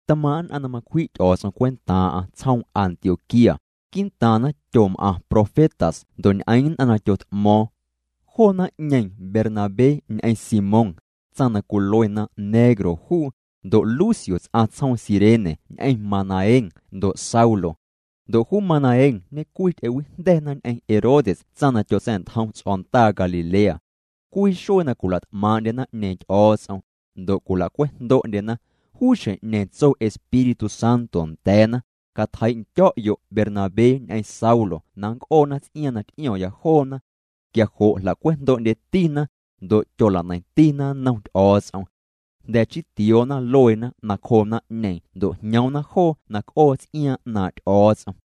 Tmaaⁿ' nn'aⁿ na macwji' Ty'o̱o̱ts'om cwentaaⁿ'aⁿ tsjoom Antioquía, quii'ntaaⁿna tyom'aⁿ profetas ndo' ñ'eeⁿ nn'aⁿ na tyot'mo̱o̱ⁿ. Joo naⁿ'ñeeⁿ Bernabé ñ'eⁿ Simón, tsaⁿ na cwiluena negro juu, ndo' Lucio ts'aⁿ tsjoom Cirene ñ'eⁿ Manaén ndo' Saulo. Ndo' juu Manaén ñecwii ty'ewijnda̱na ñ'eⁿ Herodes tsaⁿ na tyotsa̱'ntjom ts'o̱ndaa Galilea. Cwii xuee na cwila't'maaⁿ'ndye naⁿ'ñeeⁿ Ty'o̱o̱ts'om, ndo' cwilacwe'jndo'ndyena, juu xjeⁿ'ñeeⁿ tso Espíritu Santo nda̱a̱na: —Catjeii'ndyo̱'yo' Bernabé ñ'eⁿ Saulo na nnc'oona ts'iaaⁿ na t'io̱ⁿya joona. Quia jo' jlacwejndo'ndyetina, ndo' tyola'neiⁿtina nnom Ty'o̱o̱ts'om. Jnda̱ chii tioona lueena nacjoo naⁿ'ñeeⁿ ndo' jñoomna joo na c'oo ts'iaaⁿ 'naaⁿ' Ty'o̱o̱ts'om.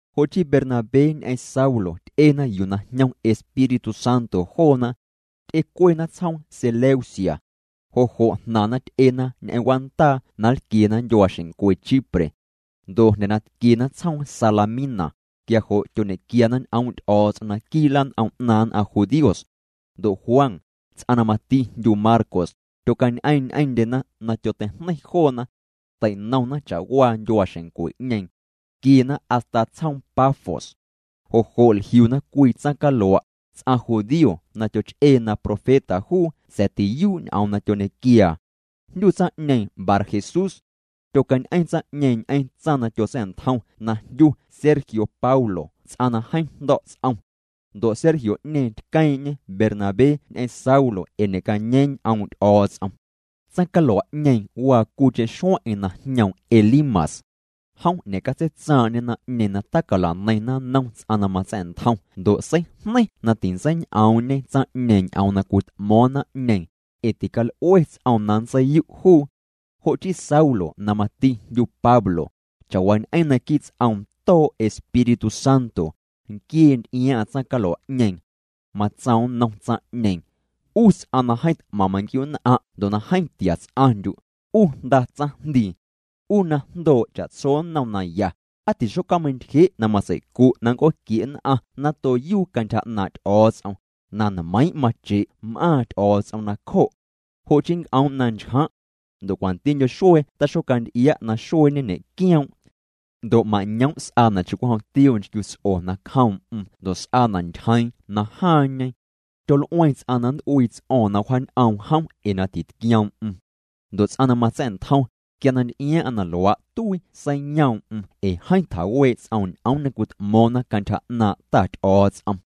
Jo' chii Bernabé ñ'eⁿ Saulo ty'ena yuu na jñom Espíritu Santo joona. Ty'ecuena tsjoom Seleucia. Jo' jo' jnaⁿna ty'ena ñ'eⁿ w'aandaa na nlquiena ndyuaaxeⁿncwe Chipre. Ndo' jnda̱ na tquiena tsjoom Salamina, quia jo' tyoñe'quiana ñ'oom' Ty'o̱o̱ts'om naquii' lan'om 'naaⁿ nn'aⁿ judíos. Ndo' Juan, ts'aⁿ na mati jndyu Marcos, tyocañ'eeⁿ ñ'eⁿndyena na tyoteijneiⁿ joona. Tei'nomna cha'waa ndyuaaxeⁿncwe'ñeeⁿ. Tquiena hasta tsjoom Pafos. Jo' jo' jliuna cwii tsaⁿcalua', ts'aⁿ judío na tyoch'ee na profeta juu sa̱a̱ tiyuu' ñ'oom tyoñequiaa. Jndyu tsaⁿ'ñeeⁿ Barjesús. Tyocañ'eⁿ tsaⁿ'ñeeⁿ ñ'eⁿ tsaⁿ na tyotsa̱'ntjom na jndyu Sergio Paulo ts'aⁿ na jeeⁿ jndo̱' ts'om. Ndo' Sergio'ñeeⁿ tqueeⁿ'ñê Bernabé ñ'eⁿ Saulo ee ñe'cañeeⁿ ñ'oom' Ty'o̱o̱ts'om. Tsaⁿcalua'ñeeⁿ waa cwiicheⁿ xueⁿ'eⁿ na jñoom Elimas. Jom ñe'catseitsaaⁿ'ñê naⁿ'ñeeⁿ na tacala'neiⁿna nnom ts'aⁿ na matsa̱'ntjom ndo' seijneiⁿ na tintseiñ'oom'ñe tsaⁿ'ñeeⁿ ñ'oom na cwit'mo̱o̱ⁿ naⁿ'ñeeⁿ, ee tical'ue ts'oom na nntseiyu' juu. Jo' chii Saulo na mati jndyu Pablo, cha'waañ'eⁿ naquii' ts'oom too' Espíritu Santo, nquiee nty'iaaⁿ'aⁿ tsaⁿcalua'ñeeⁿ. Matsoom nnom tsaⁿ'ñeeⁿ: —'U ts'aⁿ na jeeⁿ t'maⁿ manquiu'nn'aⁿ' ndo' na jeeⁿ tia ts'aⁿndyu', 'u jnda tsaⁿjndii. 'U na jndoo' cha'tso nnom na ya, ¿Aa tixocja'meintyje' na matsei'cu' na nnc'ooquie' nn'aⁿ nato na yuu cantyja 'naaⁿ' Ty'o̱o̱ts'om? Na nmeiiⁿ' mache' m'aaⁿ Ty'o̱o̱ts'om nacjo'. Jo' chii nnc'oom' na nchjaⁿ'. Ndo' cwantindyo xuee taxocanty'ia' naxueeñe ñe'quioom'. Ndo' mañoom' s'aana' cha'cwijom tioo nchquiuts'o nacjoom'm ndo' s'aana' ntyjeeⁿ najaaⁿñe. Tyol'ueeⁿ ts'aⁿ na nnt'uii ts'o̱o̱ⁿ na wjaañ'oom jom ee na titquioom'm. Ndo' ts'aⁿ na matsa̱'ntjom, quia na nty'iaaⁿ'aⁿ na luaa' tuii seiyoom'm ee jeeⁿ tjawee' ts'oom ñ'oom na cwit'mo̱o̱ⁿna cantyja 'naaⁿ' Ta Ty'o̱o̱ts'om.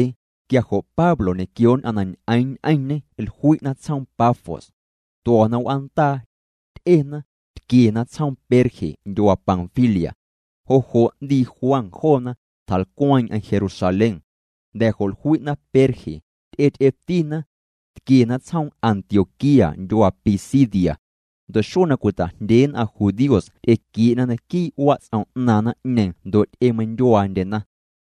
Quia jo' Pablo ñequio nn'aⁿ na ñ'eeⁿ ñ'eⁿñê jlui'na tsjoom Pafos. Tuo̱na w'aandaa. Ty'ena, tquiena tsjoom Perge ndyuaa Panfilia. Jo' jo' 'ndii Juan joona, tjalcweeⁿ'eⁿ Jerusalén. Jnda̱ jo' jlui'na Perge, ty'ety'etina. Tquiena tsjoom Antioquía ndyuaa Pisidia. Ndo' xuee na cwita'jndyee nn'aⁿ judíos ty'equie'na naquii' wats'om 'naaⁿ naⁿ'ñeeⁿ ndo' ty'emeindyuaandyena.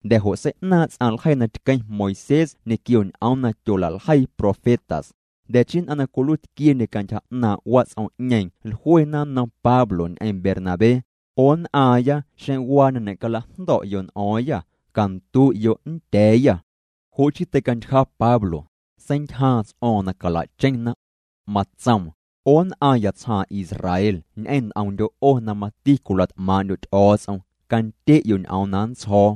Jnda̱ jo' sei'naaⁿ' ts'aⁿ ljeii na tqueⁿ Moisés ñequio ñ'oom na tyola'ljeii profetas, jnda̱ chii nn'aⁿ na cwiluiitquiendye cantyja 'naaⁿ' wats'om'ñeeⁿ jluena nnom Pablo ñ'eⁿ Bernabé: —'O nn'aaⁿya xeⁿ waa na ñe'calajndo̱'yo' n'o̱o̱ⁿyâ, candu'yo' nndya̱a̱yâ. Jo' chii teicantyja Pablo, seintyjaaⁿ ts'o̱o̱ⁿ na cala'cheⁿna. Matsoom: —'O nn'aaⁿya tsjaaⁿ Israel ñ'eⁿ nt'omndyo' 'o na mati cwila't'maaⁿ'ndyo' Ty'o̱o̱ts'om, candye'yo' ñ'oom na nntsjo̱o̱: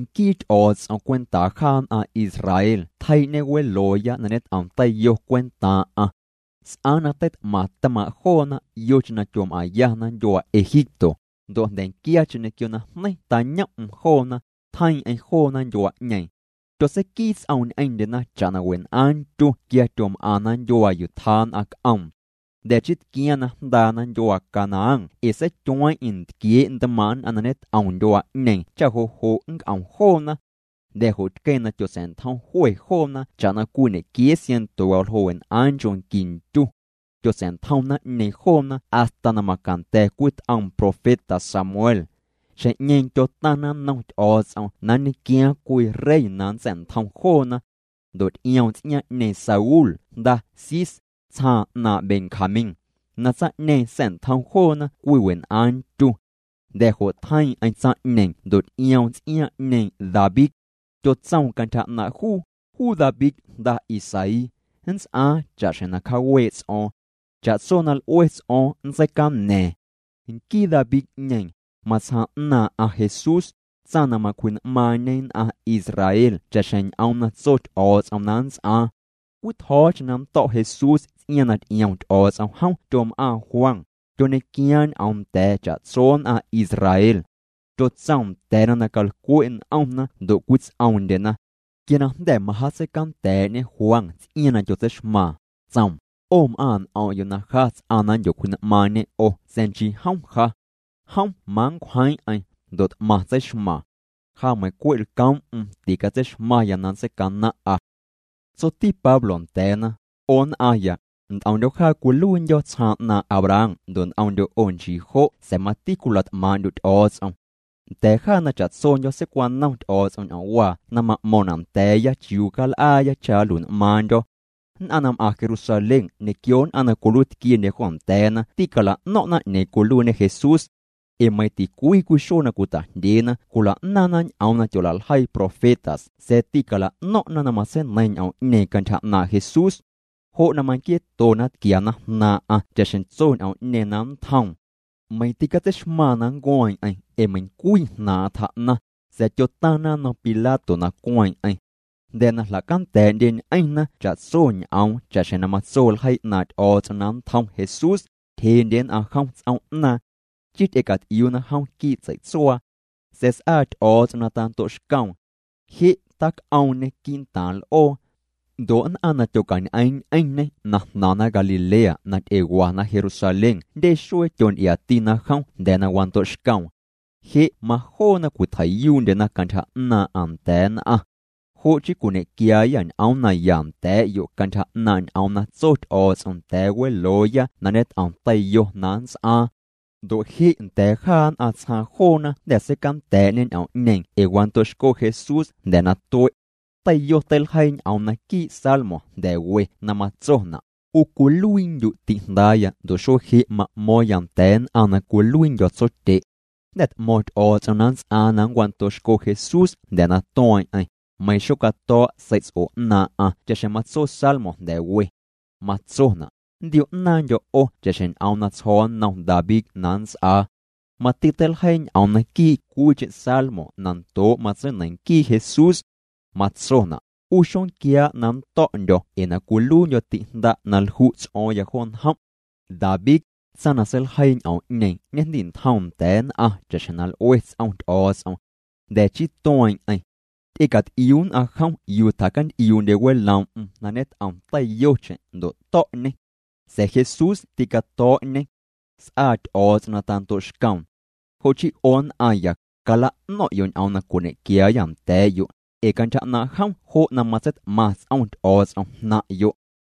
Nquii Ty'o̱o̱ts'om cwentaa jaa nn'aⁿ Israel tjeii'ñê welooya na ñet'om teiyo cwentaaⁿ'aⁿ. S'aaⁿ na teit'maⁿ tmaaⁿ' joona yocheⁿ na tyom'aⁿyana ndyuaa Egipto, ndo' jnda̱nquiacheⁿ ñequio najneiⁿ tañom'm joona, tjeiiⁿ'eⁿ joona ndyuaa'ñeeⁿ. Tyotseiquii ts'oom ñ'eⁿndyena cha'na wen'aaⁿ ntyu quia tyom'aⁿna nndyuaa yuu tjaa nn'aⁿ c'oom. Jnda̱ chii tquiaaⁿ na jndaana ndyuaa Canaán ee seityueeⁿ'eⁿ ntquiee' ntmaaⁿ' nn'aⁿ na ñet'om ndyuaa'ñeeⁿ cha jo' jo' nnc'om joona. Jnda̱ jo' tqueeⁿ na tyotsa̱'ntjom jwe joona cha'na cwii ñequiee siaⁿnto waljoo' wen'aaⁿ nchoo' qui ntyu. Tyotsa̱'ntjom naⁿ'ñeeⁿ joona hasta na macanda̱ cwii t'oom profeta Samuel. Xjeⁿ'ñeeⁿ tyotaⁿna nnom Ty'o̱o̱ts'om na nñequiaaⁿ cwii rey na nntsa̱'ntjom joona. Ndo' ty'ioom ts'iaaⁿ'ñeeⁿ Saúl jnda Cis, tsjaaⁿ 'naaⁿ' Benjamín, na tsaⁿ'ñeeⁿ sa̱'ntjom joona cwii wen'aaⁿ ntyu. Jnda̱ jo' tjeiiⁿ'eⁿ tsaⁿ'ñeeⁿ ndo' ty'ioom ts'iaaⁿ'ñeeⁿ David. Tyotsoom cantyja 'naaⁿ' juu: “Juu David jnda Isaí, nts'aaⁿ cha'xjeⁿ cjaawee' ts'o̱o̱ⁿ. Cha'tso na l'ue ts'o̱o̱ⁿ nntseicana̱a̱ⁿ.” Nquii David'ñeeⁿ, matsjaaⁿ 'naaⁿ'aⁿ Jesús, tsaⁿ na macwji'n'maaⁿñe nn'aⁿ Israel cha'xjeⁿ ñ'oom na tso Ty'o̱o̱ts'om na nnts'aaⁿ. Cwii tjo̱o̱cheⁿ na nnto̱' Jesús ts'iaaⁿ na ty'iom Ty'o̱o̱ts'om jom tyom'aaⁿ Juan, tyoñequiaaⁿ ñ'oom nda̱a̱ cha'tso nn'aⁿ Israel. Tyotsoom nda̱a̱na na calcwe' n'omna ndo' cwits'oomndyena. Quia na jnda̱ majaatseicanda̱a̱'ñe Juan ts'iaaⁿ na tyotseixmaaⁿ, tsoom: “'O m'aaⁿ' n'om'yo' na ja ts'aⁿ na nndyocwji'n'maaⁿñe 'o sa̱a̱ nchii jom ja. Jom manncwjeeⁿ'eⁿ ndo' t'maⁿ tseixmaaⁿ. Ja meiⁿ cwe' lcoom'm ticatseixmaⁿya na nntseicanaⁿ'a.” Tsoti Pablo nda̱a̱na: —'O nn'aaⁿya, nt'omndyo̱ jaa cwiluiindyo̱ tsjaaⁿ 'naaⁿ' Abraham ndo' nt'omndyo' 'o nchii jo' sa̱a̱ mati cwila't'maaⁿ'ndyo' Ty'o̱o̱ts'om. Nda̱a̱ jaa na cha'tsondyo̱ seicwanom Ty'o̱o̱ts'om ñ'oomwaa na ma'mo̱ⁿna' nda̱a̱ya chiuu cal'aaya cha nlui'n'maaⁿndyo̱. Nn'aⁿ na m'aⁿ Jerusalén ñequio nn'aⁿ na cwiluiitquiendye jo nda̱a̱na ticala'no̱ⁿ'na 'ñeeⁿ cwiluiiñe Jesús. Ee meiiⁿ ticwii cwii xuee na cwita'jndyeena cwila'naaⁿna ñ'oom na tyola'ljeii profetas sa̱a̱ ticala'no̱ⁿ'na na matseineiⁿ ñ'oom'ñeeⁿ cantyja 'naaⁿ' Jesús. Jo' na manquieetona tquiana jnaaⁿ'aⁿ cha'xjeⁿ tso ñ'oom'ñeeⁿ na nntjoom. Meiⁿ tîcatseixmaaⁿ na nncueeⁿ'eⁿ ee meiⁿcwii jnaaⁿ'aⁿ tjaa'naⁿ, sa̱a̱ tyotaⁿna nnom Pilato na cueeⁿ'eⁿ. Jnda̱ na jlacanda̱a̱'ndyeñ'eⁿna cha'tso ñ'oom cha'xjeⁿ na matso ljeii 'naaⁿ' Ty'o̱o̱ts'om na nntjom Jesús, tyjeendye nn'aⁿ jom ts'oom'naaⁿ. Chii ty'ecat'iuuna jom quii' tsei'tsuaa. Sa̱a̱ s'aa Ty'o̱o̱ts'om na tando'xcoom. Je' tac'oomñê quii'ntaaⁿ l'oo. Ndo' nn'aⁿ na tyocañ'eeⁿ ñ'eⁿñê na jnaⁿna Galilea na ty'ewana Jerusalén jndye xuee tyonty'iaatina jom jnda̱ na wando'xcoom. Je' majoona cwitjei'yuu'ndyena cantyja 'naaⁿ'aⁿ nda̱a̱ nn'aⁿ. ’Jo' chii cwiñequiaayâ ñ'oom naya nda̱a̱'yo' cantyja 'naaⁿ' ñ'oom na tso Ty'o̱o̱ts'om nda̱a̱ welooya na ñet'om teiyo na nnts'aaⁿ. Ndo' je' nda̱a̱ jaa nn'aⁿ tsjaaⁿ joona jnda̱ seicanda̱a̱'ñê ñ'oom'ñeeⁿ ee wando'xco Jesús jnda̱ na tue'. Teiyo teiljeii ñ'oom naquii' salmo jnda̱ we na matsona': “'U cwiluiindyu' ti'jndaaya ndo' xuee je' ma'mo̱o̱ⁿya nda̱a̱ nn'aⁿ na cwiluiindyo̱ tsotye'.” Jnda̱ t'mo̱ⁿ Ty'o̱o̱ts'om na nnts'aaⁿ na nncwando'xco Jesús jnda̱ na tueeⁿ'eⁿ, meiⁿ xocato̱o̱' sei'ts'o 'naaⁿ'aⁿ cha'xjeⁿ matso salmo jnda̱ we. Matsona': “Nntio'naaⁿndyo̱ 'o cha'xjeⁿ ñ'om na tsjo̱o̱ nnom David na nnts'aa.” Mati teiljeii ñ'oom naquii' cwiicheⁿ salmo na ndoo' matseineiⁿ nquii Jesús. Matsona': “'U xonquiaa' na nnto̱'ndyo̱ ee na cwiluiindyo̱ ti'jnda' na lju' ts'o̱o̱ⁿya jo njom'.” David, tsaⁿ na seiljeii ñ'oom'ñeeⁿ ñejndi'ntjoom nda̱a̱ nn'aⁿ cha'xjeⁿ na l'ue ts'om Ty'o̱o̱ts'om. Jnda̱ chii tueeⁿ'eⁿ. Ty'ecat'iuu nn'aⁿ jom yuu tjacant'iuu'ndye weloom'm na ñet'om teiyocheⁿ ndo' to̱'ñê. Sa̱a̱ Jesús tîcato̱o̱'ñê. S'aa Ty'o̱o̱ts'om na tando'xcoom. Jo' chii 'o nn'aaⁿya, cala'no̱ⁿ'yo' ñ'oom na cwiñequiaayâ nda̱a̱'yo', ee cantyja 'naaⁿ' jom jo' na matseit'maⁿ ts'om Ty'o̱o̱ts'om jnaⁿ'yo'.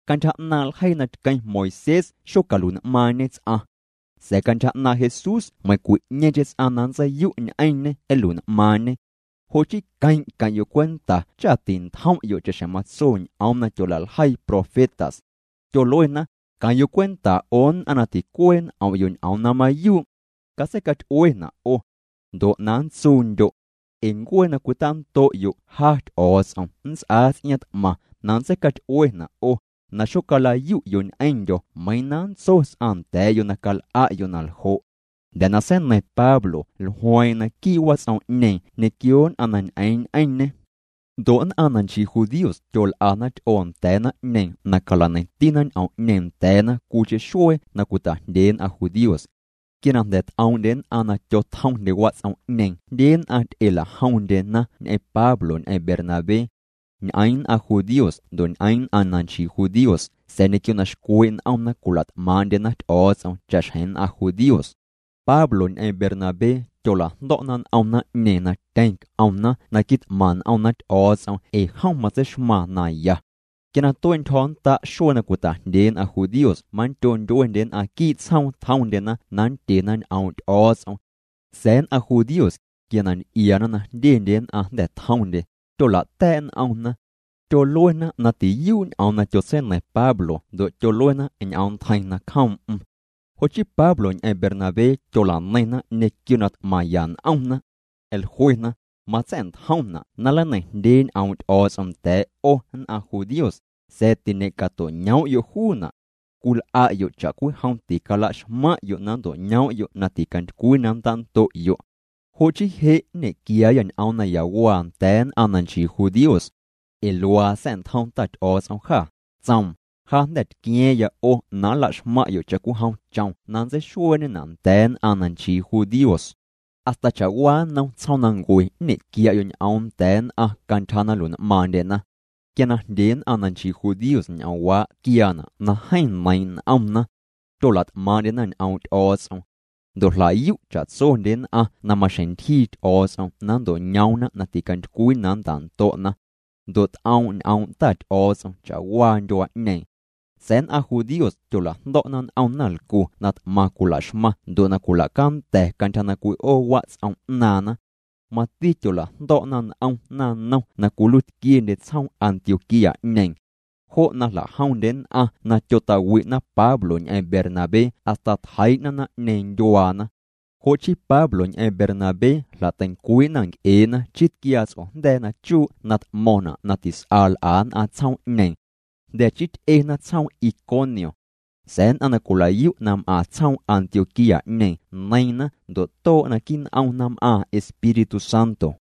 Cantyja 'naaⁿ' ljeii na tqueⁿ Moisés xocalui'n'maaⁿñe ts'aⁿ. Sa̱a̱ cantyja 'naaⁿ' Jesús meiⁿcwi'ñeeⁿcheⁿ ts'aⁿ na nntseiyu' ñ'eⁿñê nlui'n'maaⁿñe. Jo' chii queⁿ' queⁿ'yo' cwenta cha tintjom'yo' cha'xjeⁿ matso ñ'oom na tyola'ljeii profetas. Tyoluena: Queⁿ'yo' cwenta 'o nn'aⁿ na ticuee' n'om'yo' ñ'oom na mayuu'. Catseicaty'uena' 'o. Ndo' na nntsuundyo'. Ee ncuee na cwitando'yo' ja Ty'o̱o̱ts'om nnts'aa ts'iaaⁿ t'maⁿ na nntseicaty'uena' 'o, na xocala'yu'yo' ñ'eⁿndyo̱ meiiⁿ na nntso ts'aⁿ nda̱a̱'yo' na cal'a'yo' na ljo'. Jnda̱ na seineiⁿ Pablo jlueeⁿ'eⁿ naquii' wats'om'ñeeⁿ ñequio nn'aⁿ na ñ'eeⁿ ñ'eⁿñê. Ndo' nn'aⁿ na nchii judíos tyol'ana ty'oo nda̱a̱ naⁿ'ñeeⁿ na cala'neiⁿtina ñ'oom'ñeeⁿ nda̱a̱na cwiicheⁿ xuee na cwita'jndyee nn'aⁿ judíos. Quia na jnda̱ t'oom'ndye nn'aⁿ na tyotjomndye wats'om'ñeeⁿ jndye nn'aⁿ ty'elajomndyena ñ'eⁿ Pablo ñ'eⁿ Bernabé. Ñ'eeⁿ nn'aⁿ judíos ndo' ñ'eeⁿ nn'aⁿ na nchii judíos sa̱a̱ ñequio na xcwee' n'omna cwila't'maaⁿ'ndyena Ty'o̱o̱ts'om cha'xjeⁿ nn'aⁿ judíos. Pablo ñ'eⁿ Bernabé tyolajndo̱'na n'om naⁿ'ñeeⁿ na tyeⁿ c'omna na quit'maⁿ n'omna Ty'o̱o̱ts'om ee jom matseixmaaⁿ naya. Quia na tue'ntyjo̱nnda' xuee na cwita'jndyee nn'aⁿ judíos manndyo ndyuendye nn'aⁿ quii' tsjoom tjomndyena na nndyena ñ'oom' Ty'o̱o̱ts'om. Sa̱a̱ nn'aⁿ judíos, quia na nty'iaana na jndyendye nn'aⁿ jnda̱ tjomndye, tyola'ta̱a̱' n'omna. Tyoluena na tiyuu' ñ'oom na tyotseineiⁿ Pablo ndo' tyoluena ñ'oom ntjeiⁿ nacjoom'm. Jo' chii Pablo ñ'eⁿ Bernabé tyolaneiⁿna ñequio na t'maⁿya n'omna. Jluena: —Matsa̱'ntjomna' na nleineiⁿjndyee ñ'oom' Ty'o̱o̱ts'om nda̱a̱' 'o nn'aⁿ judíos, sa̱a̱ tiñe'cato'ñoom'yo' juuna'. Cwil'a'yo' cha'cwijom ticalaxmaⁿ'yo' na nnto'ñoom'yo' na ticantycwii na nntando'yo'. Jo' chii je' nñequiaayâ ñ'oom nayawaa nda̱a̱ nn'aⁿ na nchii judíos. Ee luaa sa̱'ntjom Ta Ty'o̱o̱ts'om jâ, tsoom: Ja jnda̱ tqua̱a̱ⁿya 'o na nlaxmaⁿ'yo' cha'cwijom chom na nntseixueeñena' nda̱a̱ nn'aⁿ na nchii judíos. Hasta cha'waa nnom tsjoomnancue nñequia'yo' ñ'oom nda̱a̱ nn'aⁿ cantyja na nlui'n'maaⁿndyena. Quia na jndye nn'aⁿ na nchii judíos ñ'oomwaa' tquiaana' na jeeⁿ neiiⁿ' n'omna. Tyolat'maaⁿ'ndyena ñ'oom' Ty'o̱o̱ts'om. Ndo' jlayu' cha'tsondye nn'aⁿ na maxjeⁿ ntyjii Ty'o̱o̱ts'om na nnto'ñoomna na ticantycwii na nntando'na. Ndo' t'oom' ñ'oom' Ta Ty'o̱o̱ts'om cha'waa ndyuaa'ñeeⁿ. Sa̱a̱ nn'aⁿ judíos tyolajndo̱'na n'om naⁿlcu na t'maⁿ cwilaxmaⁿ ndo' na cwilacanda̱ cantyja na cwi'oo wats'om 'naaⁿna. Mati tyolajndo̱'na n'om naⁿnom na cwiluiitquiendye tsjoom Antioquía'ñeeⁿ. Jo' na jla'jomndye nn'aⁿ na tyota'wi'na Pablo ñ'eⁿ Bernabé hasta tjeii'na naⁿ'ñeeⁿ ndyuaana. Jo' chii Pablo ñ'eⁿ Bernabé jla'teincwii'na nc'ee'na chii tquiaa ts'ojnda̱a̱ na chuu' na t'mo̱ⁿna' na tis'a l'a nn'aⁿ tsjoom'ñeeⁿ. Jnda̱ chii ty'ena tsjoom Iconio. Sa̱a̱ nn'aⁿ na cwilayu' na m'aⁿ tsjoom Antioquía'ñeeⁿ neiiⁿna ndo' too' naquii' n'omna m'aaⁿ Espíritu Santo.